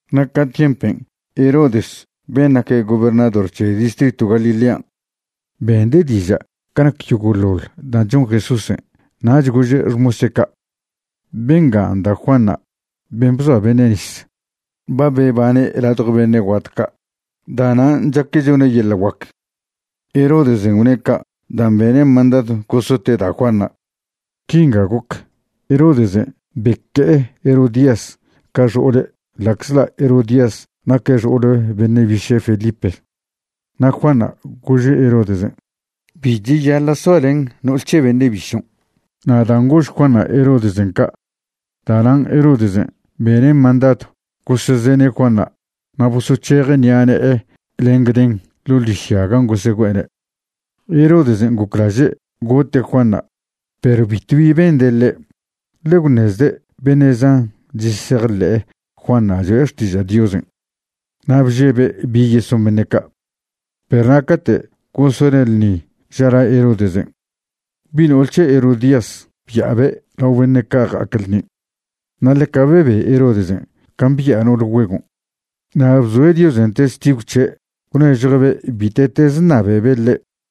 Na' ca tiempen' Herodes ben' naque' gobernador c̱he distritw Galilean', bende' diža' ca nac yogo'ḻoḻ dan' chon Jesúsen'. Nach gože' xmose' ca': ―Bengan' da' Juanṉa', ben' bzoa beṉe' nis. Ba bebane' ladjo beṉe' guat ca', da'nan' chaque' chone' yeḻa' guac. Herodesen' gwne' ca' dan' bene' mandadw gosote' da' Juanṉa'. Quingan' goc: Herodesen' beque'e Herodías ca xo'ole' ḻa'czḻa' Herodías naque' xo'ole beṉe' biše' Felipe. Na' Juanṉa' gože' Herodesen': ―Bi cheyaḻa' soalen no'ol c̱he beṉe' bišon'. Na' dan' gož Juanṉa' Herodesen' ca', da'nan' Herodesen' bene' mandadw gosezene' Juanṉa' na' bosoc̱heje' ṉi'a ne'e len gden ḻo' ḻižya gan' gosegüe'ene'. Herodesen' goclaže' gote' Juanṉa', perw bitwbi bende' ḻe', ḻe gwṉezde' beṉe' zan chesejḻe'e Juanṉa' cho'e xtiža' Diosen', na' bžebe' bi yeson beṉe' ca'. Perw na' cate' gosone' ḻṉin' ža la Herodesen', bi' no'ol c̱he Herodías bya'abe' lao beṉe' ca' ja'ac ḻṉin'. Na' ḻeca bebe Herodesen' can' bya'a no'ol güegon', na' bzoe' Diosen' testigw c̱he' gwnežjue'be' bite'teze ṉabebe' ḻe'.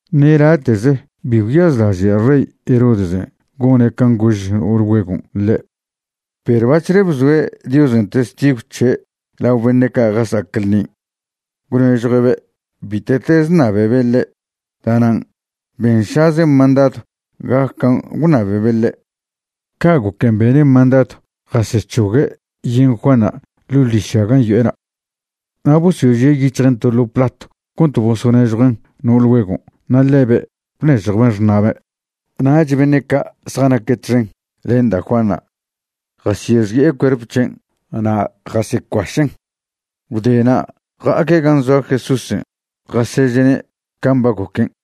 Ṉe late'ze bi gwyazlaže' rey Herodesen' gone' can' gož no'ol güegon' ḻe', perw bac̱hle bzoe' Diosen' testigw c̱he' lao beṉe' ca' jasa'ac ḻṉin' gwnežjue'be' bite'teze ṉabebe' ḻe', da'nan' benšaze' mandadw gac can' gwṉabebe' ḻe'. Ca' goquen' bene' mandadw jasec̱hogue' yen Juanṉa' ḻo' ḻižya gan' yo'ena'. Na' bosožie' yic̱hjen' to ḻo platw cont bosoṉežjuen' no'ol güegon' na' ḻebe' bnežjwben' xṉa'be'. Nach beṉe' ca' zjanaque' txen len da' Juanṉa' jasyexi'e cuerp c̱hen' na' jasecuašen'. Gwde na' ja'aque' gan' zoa Jesúsen' jaseže'ne' can' ba goquen'.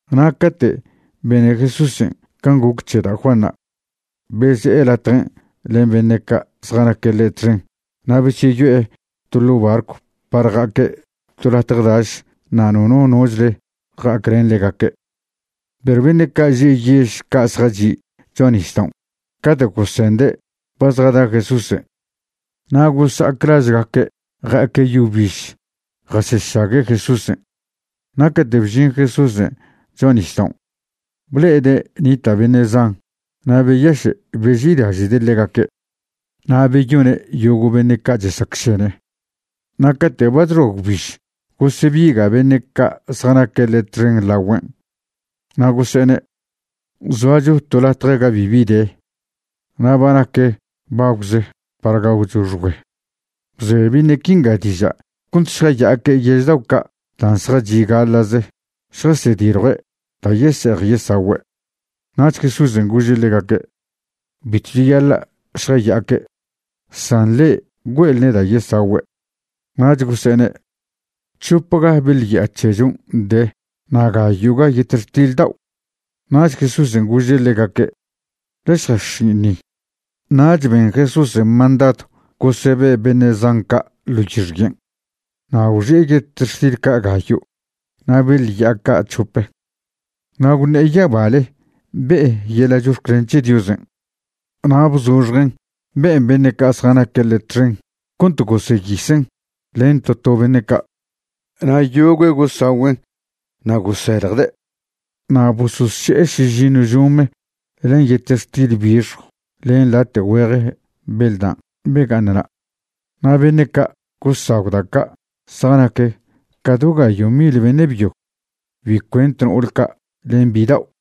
Na' cate' bene Jesúsen' can' goc c̱he da' Juanṉa', beze'e latjen' len beṉe' ca' zjanaque' ḻe' txen na' besyeyo'e to ḻo' barcw par ja'aque' to latje daš na' nono nochle ja'aclen ḻegaque'. Perw beṉe' ca' že' yež ca' zjachi' cho'a nisdaon' cate' gosende' ba zjada Jesúsen', na' gosa'ac lažgaque' ja'aque' yo biž jasešague' Jesúsen'. Na' cate' bžin Jesúsen' cho'a nisdaon', ble'ede' nita' beṉe' zan na' beyaše' beži'ilaže'de' ḻegaque'. Na' beyone' yogo' beṉe' ca' chesacšene. Na' cate' ba chxoa gwbiž gosebiga' beṉe' ca' zjanaque' ḻe' txen lagüen', na' gose'ene': ―Zoacho to latje ga bibi de, na' ba nac bagwže' par gagwcho xgüe. Bze beṉe' quinga diža' cont šjaya'aque' yež dao' ca' dan' zjachi' gaḻa'ze šjasediljue' da' yese'ej yesagüe'. Nach Jesúsen' gože' ḻegaque': ―Bitw cheyaḻa' šjaya'aque', san le'e güe'elne' da' yesagüe'. Nach gose'ene': ―C̱hopga beḻ ya'a c̱hechon' de na' gayo'ga yetextil dao'. Nach Jesúsen' gože' ḻegaque': ―Ḻe šjax̱in' ni. Nach ben Jesúsen' mandadw gosebe' beṉe' zan ca' ḻo yixyen'. Na' gwxi'e yetextil ca' gayo' na' beḻ ya'a ca' c̱hope, na' gwṉe'e yabale be'e yeḻa' chox̱clen c̱he Diosen', na' bzoxjen' be'en beṉe' ca' zjanaque' ḻe' txen cont goseyisen' len to to beṉe' ca'. Na' yogüe' gosagüen' na' goseljde'. Na' bososše'e šižiṉw žome len yetextil bixjw len late' güeje beḻ dan' bega'aṉna'. Na' beṉe' ca' gosagw da' ca' zjanaque' ca do gayo' mil beṉe' byo, bi cuent no'ol ca' len bidao'.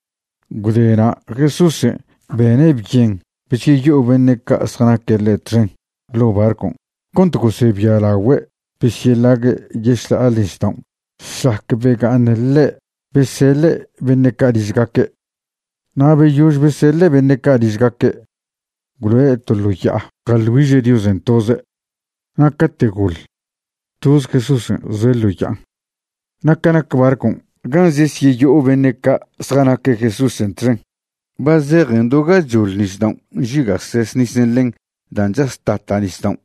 Gwde na' Jesúsen' bene' byen besyeyo'o beṉe' ca' zjanaque' ḻe' txen ḻo' barcon' cont gosebialagüe' besyeḻague' yešḻa'ale nisdaon' šlac bega'aṉ ḻe' beseḻe' beṉe' ca' ližgaque'. Na' beyož beseḻe' beṉe' ca' ližgaque', gwloe' to ḻo ya'a jaḻ güiže' Diosen' toze'. Na' cate' goḻ, toz Jesúsen' zoe' ḻo ya'an. Na' ca nac barcon' gan' zesyeyo'o beṉe' ca' zjanaque' Jesúsen' txen, ba zejen do gachoḻ nisdaon' nžiga'ses nisen' ḻen dan' chas chata' nisdaon',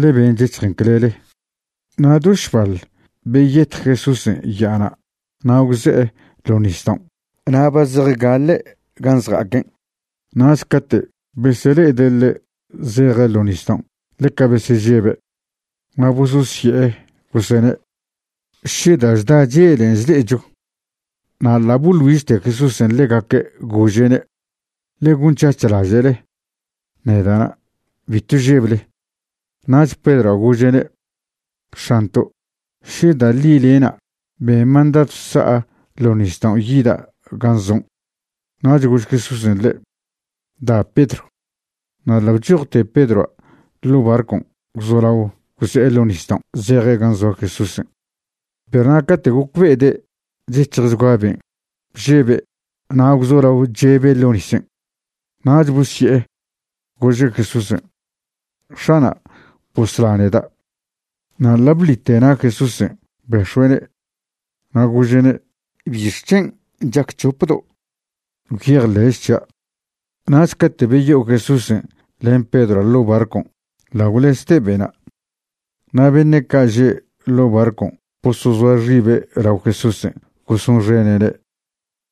ḻe ben' chec̱hjen clele. Na' do šbal beyetj Jesúsen' ya'ana' na' gwze'e ḻo nisdaon' na' ba zejgaḻe' gan' zja'aquen'. Nach cate' besele'ede' ḻe' zeje' ḻo nisdaon' ḻeca besežebe', na' bososye'e gosene': ―¡Še da' chda chelen' chle'echo! Na' ḻa' boḻ güižte Jesúsen' ḻegaque', gože'ne': ―Ḻe gonc̱hac̱h laže'le. Neda'na'. Bitw žeble. Nach Pedroa' gože'ne': ―X̱anto', še da' ḻi le'na', ben mandadw sa'a ḻo nisdaon' yida' gan' zon'. Nach gož Jesúsen' ḻe': ―Da, Pedro. Na' ḻa' bchojte Pedroa' ḻo' barcon' gwzolao gwze'e ḻo nisdaon' zeje' gan' zoa Jesúsen'. Perw na' cate' gocbe'ede' chec̱hjchgua ben', bžebe' na' gwzolao chebe' ḻo' nisen'. Nach bosye'e, gože' Jesúsen': ―X̱ana', bosla neda'. Na' ḻa' bḻite na' Jesúsen' bex̱ue'ne', na' gože'ne': ―¿Bixc̱hen' chac c̱hopdo'? Gwyejḻe'ch c̱hia'. Nach cate' beyo'o Jesúsen' len Pedroa' ḻo' barcon', ḻa' gwlezte be'na'. Na' beṉe' ca' že' ḻo' barcon' bosozoa xibe' lao Jesúsen' gosonxene'ne',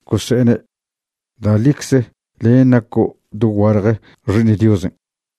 gose'ene': ―Da' ḻicze len' naco' doguale Xi'iṉ Diosen'.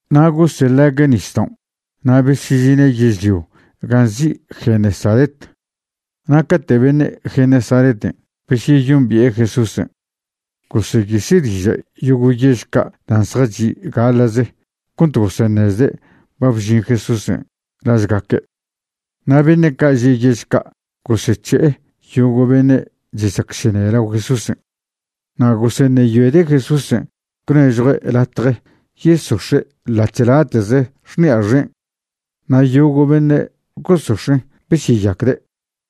Na' goseḻague' nisdaon' na' besežine' yežlio gan' nzi' Genesaret. Na' cate' beṉe' Genesareten' besyeyombi'e Jesúsen', goseyise' diža' yogo' yež ca' dan' zjachi' gaḻa'ze cont goseṉezde' ba bžin Jesúsen' lažgaque'. Na' beṉe' ca' že' yež ca' gosec̱he'e yogo' beṉe' chesacšene lao Jesúsen'. Na' goseṉeyoede' Jesúsen' gwnežjue' latje yesox̱e' ḻa'ch late'ze xṉi'a xen'. Na' yogo' beṉe' gosox̱en' besyeyaquede'.